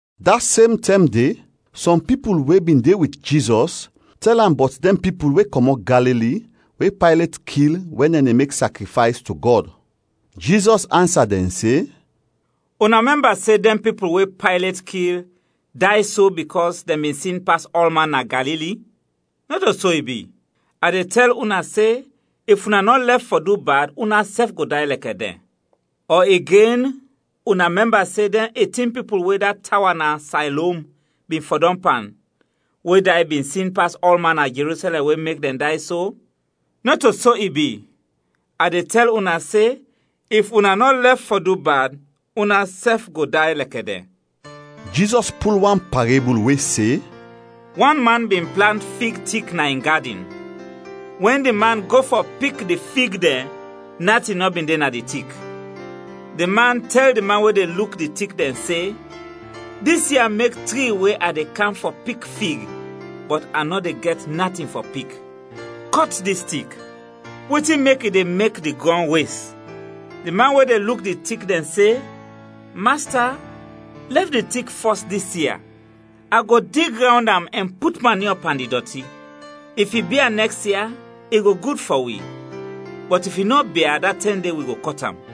Da sem tɛm de, sɔm pipul we bin de wit Jizɔs tɛl am bɔt dɛn pipul we kɔmɔt Galili we Paylet kil wɛn dɛn de mek sakrifays to Gɔd. Jizɔs ansa dɛn se, “Una mɛmba se dɛn pipul we Paylet kil day so bikɔs dɛn bin sin pas ɔlman na Galili? Nɔto so i bi; a de tɛl una se if una nɔ lɛf fɔ du bad, unasɛf go day lɛkɛ dɛn. Ɔ igen una mɛmba se dɛn etin pipul we da tawa na Saylom bin fɔdɔm pan, we day, bin sin pas ɔlman na Jerusɛlɛm we mek dɛn day so? Nɔto so i bi; a de tɛl una se if una nɔ lɛf fɔ du bad, unasɛf go day lɛkɛ dɛn.” Jizɔs pul wan parebul we se: “Wan man bin plant fig tik na in gadin. Wɛn di man go fɔ pik di fig dɛn natin nɔ bin de na di tik. Di man tɛl di man we de luk di tik dɛn se, ‘Dis ia mek tri we a de kam fɔ pik fig, bɔt a nɔ de gɛt natin fɔ pik. Kɔt dis tik! Wetin mek i de mek di grɔn wes?’ Di man we de luk di tik dɛn se, ‘Masta, lɛf di tik fɔs dis ia. A go dig rawnd am ɛn put maniɔ pan di dɔti. If i bia nɛks ia, i go gud fɔ wi, bɔt if i nɔ bia, da tɛm de wi go kɔt am.’”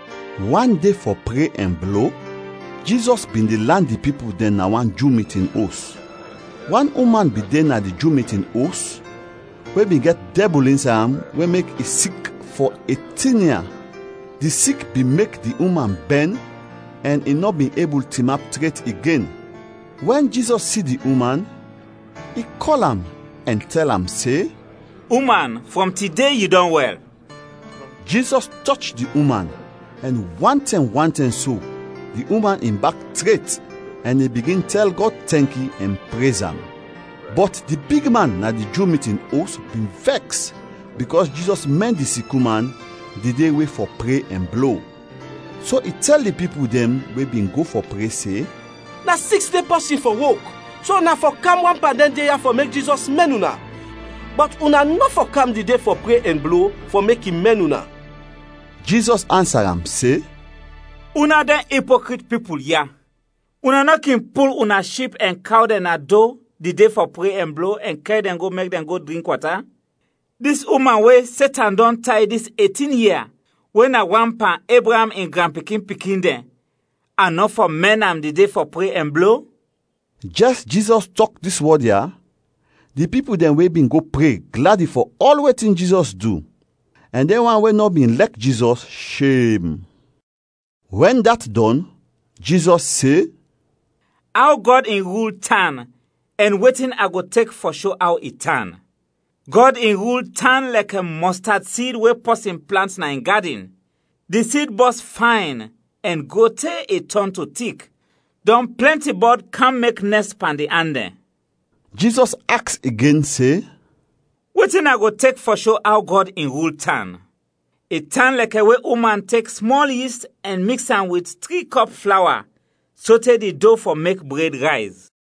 Wan de fɔ pre ɛn blo, Jizɔs bin de lan di pipul dɛn na wan Ju mitin os. Wan uman bin de na di Ju mitin os we bin gɛt dɛbul insay am we mek i sik fɔ etin ia. Di sik bin mek di uman bɛn ɛn i nɔ bin ebul tinap tret igen. Wɛn Jizɔs si di uman, i kɔl am ɛn tɛl am se, “Uman, frɔm tide yu dɔn wɛl!” Jizɔs tɔch di uman ɛn wantɛm wantɛm so di uman in bak tret ɛn i bigin tɛl Gɔd tɛnki ɛn prez am. Bɔt di bigman na di Ju mitin os bin vɛks bikɔs Jizɔs mɛn di sik uman di de we fɔ pre ɛn blo, so i tɛl di pipul dɛn we bin go fɔ pre se, “Na siks de pɔsin fɔ wok, so una fɔ kam wan pan dɛn de ya fɔ mek Jizɔs mɛn una; bɔt una nɔ fɔ kam di de fɔ pre ɛn blo fɔ mek i mɛn una.” Jizɔs ansa am se, “Una dɛn ipokrit pipul ya! Una nɔ kin pul una ship ɛn kaw dɛn na do di de fɔ pre ɛn blo ɛn kɛr dɛn go mek dɛn go drink wata? Dis uman we Setan dɔn tay dis etin ia, we na wan pan Ebraam in granpikin-pikin dɛn, a nɔ fɔ mɛn am di de fɔ pre ɛn blo?” Jɛs Jizɔs tɔk dis wɔd ya, di pipul dɛn we bin go pre gladi fɔ ɔl wetin Jizɔs du, ɛn dɛn wan we nɔ bin lɛk Jizɔs, shem. Wɛn dat dɔn, Jizɔs se, “Aw Gɔd in rul tan ɛn wetin a go tek fɔ sho aw i tan? Gɔd in rul tan lɛkɛ mɔstad sid we pɔsin plant na in gadin, di sid bɔs fayn ɛn gro te i tɔn to tik, dɔn plɛnti bɔd kam mek nɛst pan di an dɛn.” Jizɔs aks igen se, “Wetin a go tek fɔ sho aw Gɔd in rul tan? I tan lɛkɛ we uman tek smɔl yist ɛn miks am wit tri kɔp flawa sote di do fɔ mek bred rayz.”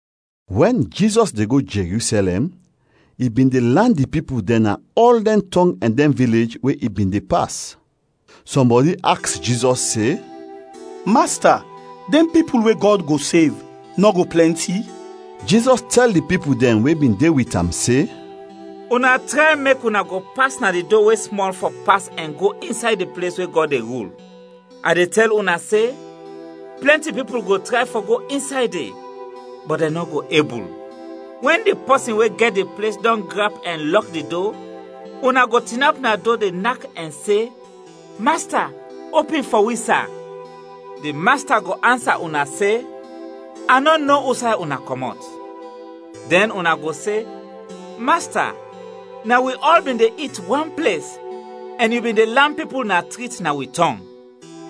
Wɛn Jizɔs de go Jerusɛlɛm, i bin de lan di pipul dɛn na ɔl dɛn tɔng ɛn dɛn vilej we i bin de pas. Sɔmbɔdi aks Jizɔs se, “Masta, dɛn pipul we Gɔd go sev nɔ go plɛnti?” Jizɔs tɛl di pipul dɛn we bin de wit am se, “Una tray mek una go pas na di do we smɔl fɔ pas ɛn go insay di ples we Gɔd de rul. A de tɛl una se, plɛnti pipul go tray fɔ go insay de, bɔt dɛn nɔ go ebul. Wɛn di pɔsin we gɛt di ples dɔn grap ɛn lɔk di do, una go tinap na do de nak ɛn se, ‘Masta, opin fɔ wi, sa!’ Di masta go ansa una se, ‘A nɔ no usay una kɔmɔt.’ Dɛn una go se, ‘Masta, na wi ɔl bin de it wan ples ɛn yu bin de lan pipul na trit na wi tɔng.’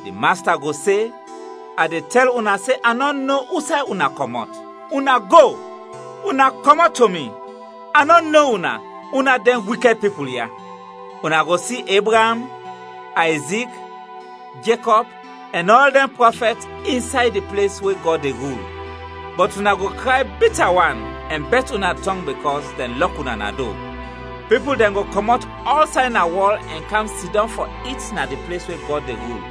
Di masta go se, ‘A de tɛl una se a nɔ no usay una kɔmɔt, una go, una kɔmɔt to mi; a nɔ no una, una dɛn wikɛd pipul ya!’ Una go si Ebraam, Ayzik, Jekɔb ɛn ɔl dɛn prɔfɛt insay di ples we Gɔd de rul, bɔt una go kray bita wan ɛn bɛt una tɔng bikɔs dɛn lɔk una na do. Pipul dɛn go kɔmɔt ɔlsay na wɔl ɛn kam sidɔm fɔ it na di ples we Gɔd de rul.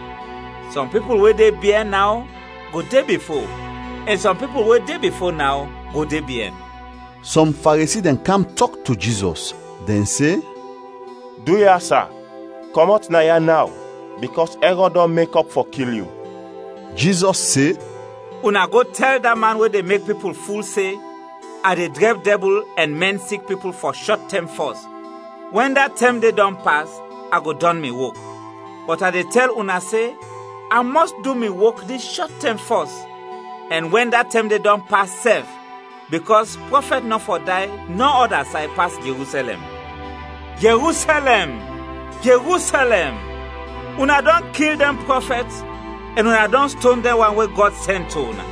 Sɔm pipul we de biɛn naw go de bifo ɛn sɔm pipul we de bifo naw go de biɛn.” Sɔm Faresi dɛn kam tɔk to Jizɔs, dɛn se, “Duya, sa, kɔmɔt naya naw bikɔs Ɛrɔd dɔn mekɔp fɔ kil yu.” Jizɔs se, “Una go tɛl da man de we de mek pipul ful se, ‘A de drɛb dɛbul ɛn mɛn sik pipul fɔ shɔt tɛm fɔs, wɛn da tɛm de dɔn pas, a go dɔn mi wok.’ Bɔt a de tɛl una se, a mɔs du mi wok dis shɔt tɛm fɔs ɛn wɛn da tɛm de dɔn pas sɛf, bikɔs prɔfɛt nɔ fɔ day nɔ ɔda say pas Jerusɛlɛm! “Jerusɛlɛm, Jerusɛlɛm; una dɔn kil dɛn prɔfɛt ɛn una dɔn ston dɛn wan we Gɔd sɛn to una!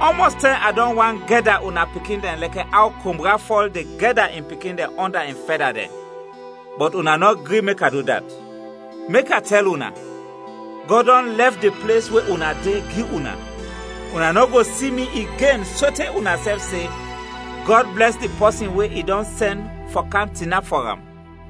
Ɔmɔs tɛm a dɔn want gɛda una pikin dɛn lɛkɛ aw kombra fɔl de gɛda in pikin dɛn ɔnda in fɛda dɛn, bɔt una nɔ gri mek a du dat! Mek a tɛl una, Gɔd dɔn lɛf di ples we una de, gi una. Una nɔ go si mi igen sote unasɛf se, ‘Gɔd blɛs di pɔsin we i dɔn sɛn fɔ kam tinap fɔ am!’”